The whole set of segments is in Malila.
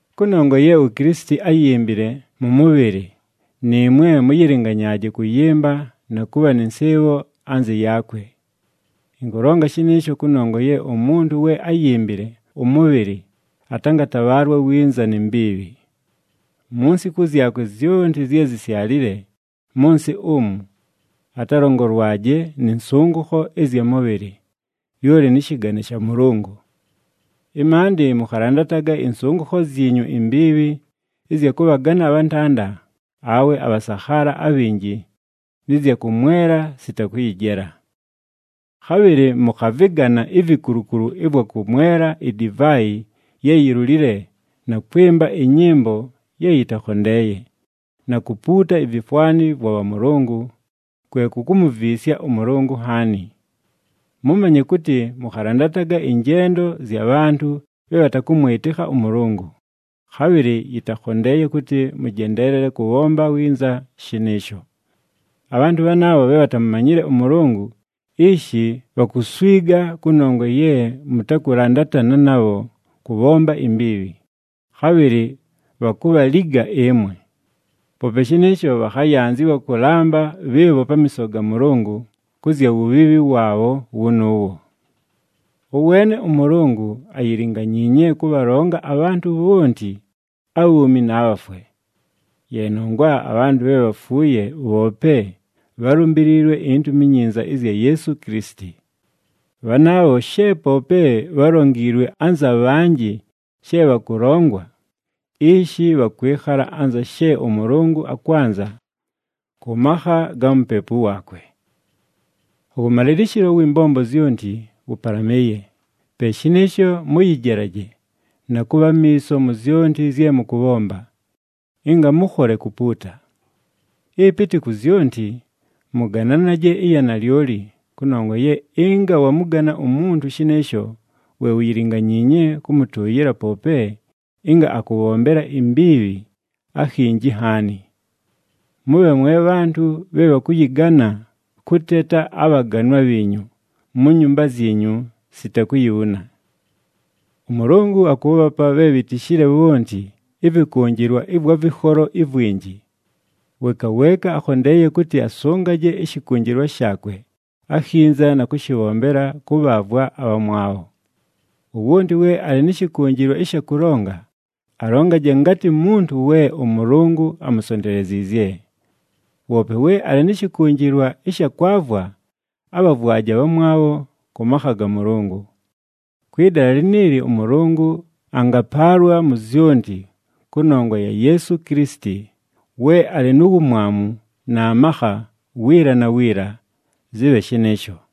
Kʉnongwa ye uKilisiti áyimbile mʉ mʉbhɨlɨ, nɨɨmwe mʉyɨlɨnganyaaje kʉyɨmba na kʉbha nɨ nsɨɨbho anzɨ yaakwe. Ɨnkʉlonga shɨnɨɨsho kʉnongwa ye umuntu we áyimbile ʉmʉbhɨlɨ atangatabhaalwa winza ni mbiibhi. Mu nsiku zyakwe zyonti zye zisyalile mʉ nsɨ umu, atalongolwaje nɨ nsʉngʉkho ɨzya mʉbhɨlɨ, lyoli nɨ shɨgane sha Mʉlʉngʉ. Ɨmaandɨ mʉkhalandataga ɨnsʉngʉkho zyinyu imbiibhi ɨzya kʉbhagana abhantanda awe abhasakhaala abhinji nɨ zya kʉmwela sita kʉyɨjela. Khabhɨlɨ mʉkhavɨgana ivikulukulu ɨvwa kʉmwela idivaayi ye yilulile na kwɨmba ɨnyɨmbo ye yɨtakhondeeye, na kupuuta ivifwani vwa bhamʉlʉngʉ kwe kukumuviisya ʉMʉlʉngʉ nhaani. Mʉmanye kʉtɨ mʉkhalandataga ɨnjendo zya bhantʉ bhe bhatakʉmwɨtɨkha ʉMʉlʉngʉ, khabhɨlɨ yɨtakhondeeye kʉtɨ mʉjendeelele kʉbhomba winza shɨnɨɨsho. Abhantʉ bhanaabho bhe bhatamumanyile ʉMʉlʉngʉ, ishi bhakuswiga kʉnongwa ye mʉtakʉlandatana nabho kʉbhomba imbiibhi, khabhɨlɨ bhakubhaliga ɨmwe. Poope shɨnɨɨsho, bhakhayanzɨwa kʉlamba bhɨɨbho pamiiso ga Mʉlʉngʉ kʉ zya wubhiibhi waabho wʉnʉʉwo. Ʉweene ʉMʉlʉngʉ ayilinganyiinye kʉbhalonga abhantʉ bhonti abhuumi na bhafwe. Ye nongwa abhantʉ bhe bhafuuye bhoope bhálumbiliilwe iNtumi iNyinza ɨzya Yeesu Kilisiti. Bhanaabho, she poope bhálongiilwe anza bhanjɨ she bhakʉlongwa, ishi bhakwɨkhala anza she ʉMʉlʉngʉ akwanza kʉ makha ga Mupepu waakwe. Ʉwʉmalɨlɨshɨlo ʉwɨ mbombo zyonti wʉpalamɨɨye, pe shɨnɨɨsho mʉyɨjelaje na kʉbha amiiso mu zyonti zye mʉkʉbhomba, ɨnga mʉkhole kupuuta. Ɨpɨtɨ ku zyonti, mʉgananaje ɨya nalyoli, kʉnongwa ye ɨnga wamʉgana umuntu shɨnɨɨsho we uyilinganyiinye kʉmʉtʉʉyɨla poope ɨnga akʉbhombela imbiibhi akhinji nhaani. Mʉbhe mwe bhantʉ bhe bhakʉyɨgana kʉteta abhaganwa bhiinyu mu nyumba zyinyu sita kuyibhuna. ɄMʉlʉngʉ akʉʉbhapa bhe bhitishile bhonti ɨvɨkʉnjɨlwa ɨvwa vɨkholo ivwinji. Weeka weeka akhondeeye kʉtɨ asʉngaje ɨshɨkʉnjɨlwa shaakwe akhinza na kʉshɨbhombela kʉbhaavwa abhamwabho. Wowonti we alɨ nɨ shɨkʉnjɨlwa ɨsha kʉlonga, alongaje ngatɨ muntu we ʉMʉlʉngʉ amusonteleziizye. Woope we alɨ nɨ shɨkʉnjɨlwa ɨsha kwavwa, abhavwaje abhamwabho kʉ makha ga Mʉlʉngʉ. Kwɨ dala liniili ʉMʉlʉngʉ angapaalwa mu zyonti kʉnongwa ya Yeesu Kilisiti, we alɨ nu wumwamu na makha wiila na wiila. Zɨbhe shɨnɨɨsho.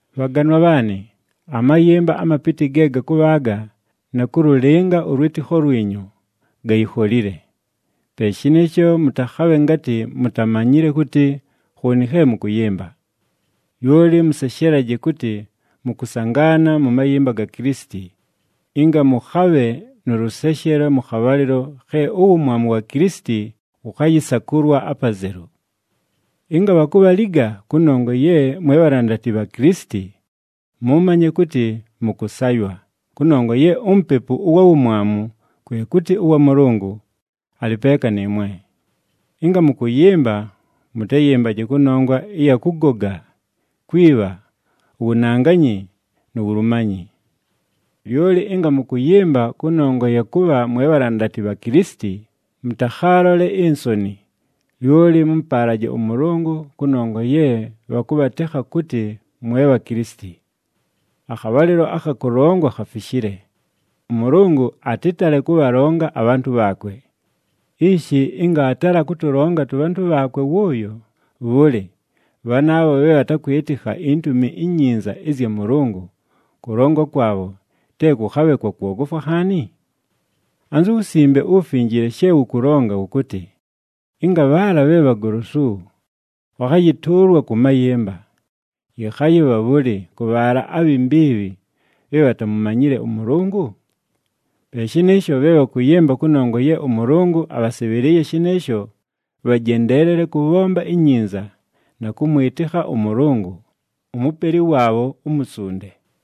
Bhaganwa bhaanɨ, amayɨmba amapɨtɨ ge gakʉbhaaga na kʉlʉlɨnga ʉlwɨtɨkho lwinyu, gayikholile. Pe shɨnɨɨsho mʉtakhabhe ngatɨ mutamanyile kʉtɨ khooni khe mʉkʉyɨmba. Lyoli mʉseshelaje kʉtɨ mʉkʉsangaana mʉ mayɨmba ga Kilisiti, ɨnga mʉkhabhe nʉ lʉseshelo mʉ khabhalɨlo khe uwumwamu wa Kilisiti wʉkhayɨsakʉlwa apazelu. Ɨnga bhakubhaliga kʉnongwa ye mwe bhalandati bha Kilisiti, mʉmanye kʉtɨ mʉkʉsaywa, kʉnongwa ye uMupepu ʉwa Wumwamu, kwe kʉtɨ ʉwa Mʉlʉngʉ, alɨ peeka nɨɨmwe. Ɨnga mʉkʉyɨmba, mʉtayɨmbaje kʉnongwa ɨya kʉgoga, kwibha, uwunanganyi, nu wulumanyi. Lyoli ɨnga mʉkʉyɨmba kʉnongwa ya kʉbha mwe bhalandati bha Kilisiti, mʉtakhaalole insoni, lyoli mʉmʉpaalaje ʉMʉlʉngʉ kʉnongwa ye bhakʉbhatekha kʉtɨ mwe bha Kilisiti. Akhabhalɨlo akha kʉlongwa khafishile, ʉMʉlʉngʉ atɨtale kʉbhalonga abhantʉ bhaakwe. Ishi ɨnga aatala kʉtʉlonga tʉbhantʉ bhaakwe wʉʉyo, bhʉlɨ, bhanaabho bhe bhatakwɨtɨkha iNtumi iNyinza ɨzya Mʉlʉngʉ kʉlongwa kwabho te kʉkhabhe kwa kwogofwa nhaani? Anzu Wusimbe uWufinjile she wʉkʉlonga wʉkʉtɨ, “Ɨnga bhaala bhe bhagolosu bhakhayɨtʉʉlwa kʉ mayɨmba, yɨkhayɨbha bhʉlɨ kʉ bhaala abhi mbiibhi bhe bhatamumanyile ʉMʉlʉngʉ?” Pe shɨnɨɨsho, bhe bhakʉyɨmba kʉnongwa ye ʉMʉlʉngʉ abhasɨbhɨlɨɨye shɨnɨɨsho, bhajendeelele kʉbhomba inyinza na kʉmwɨtɨkha ʉMʉlʉngʉ, uMupeli waabho umusunde.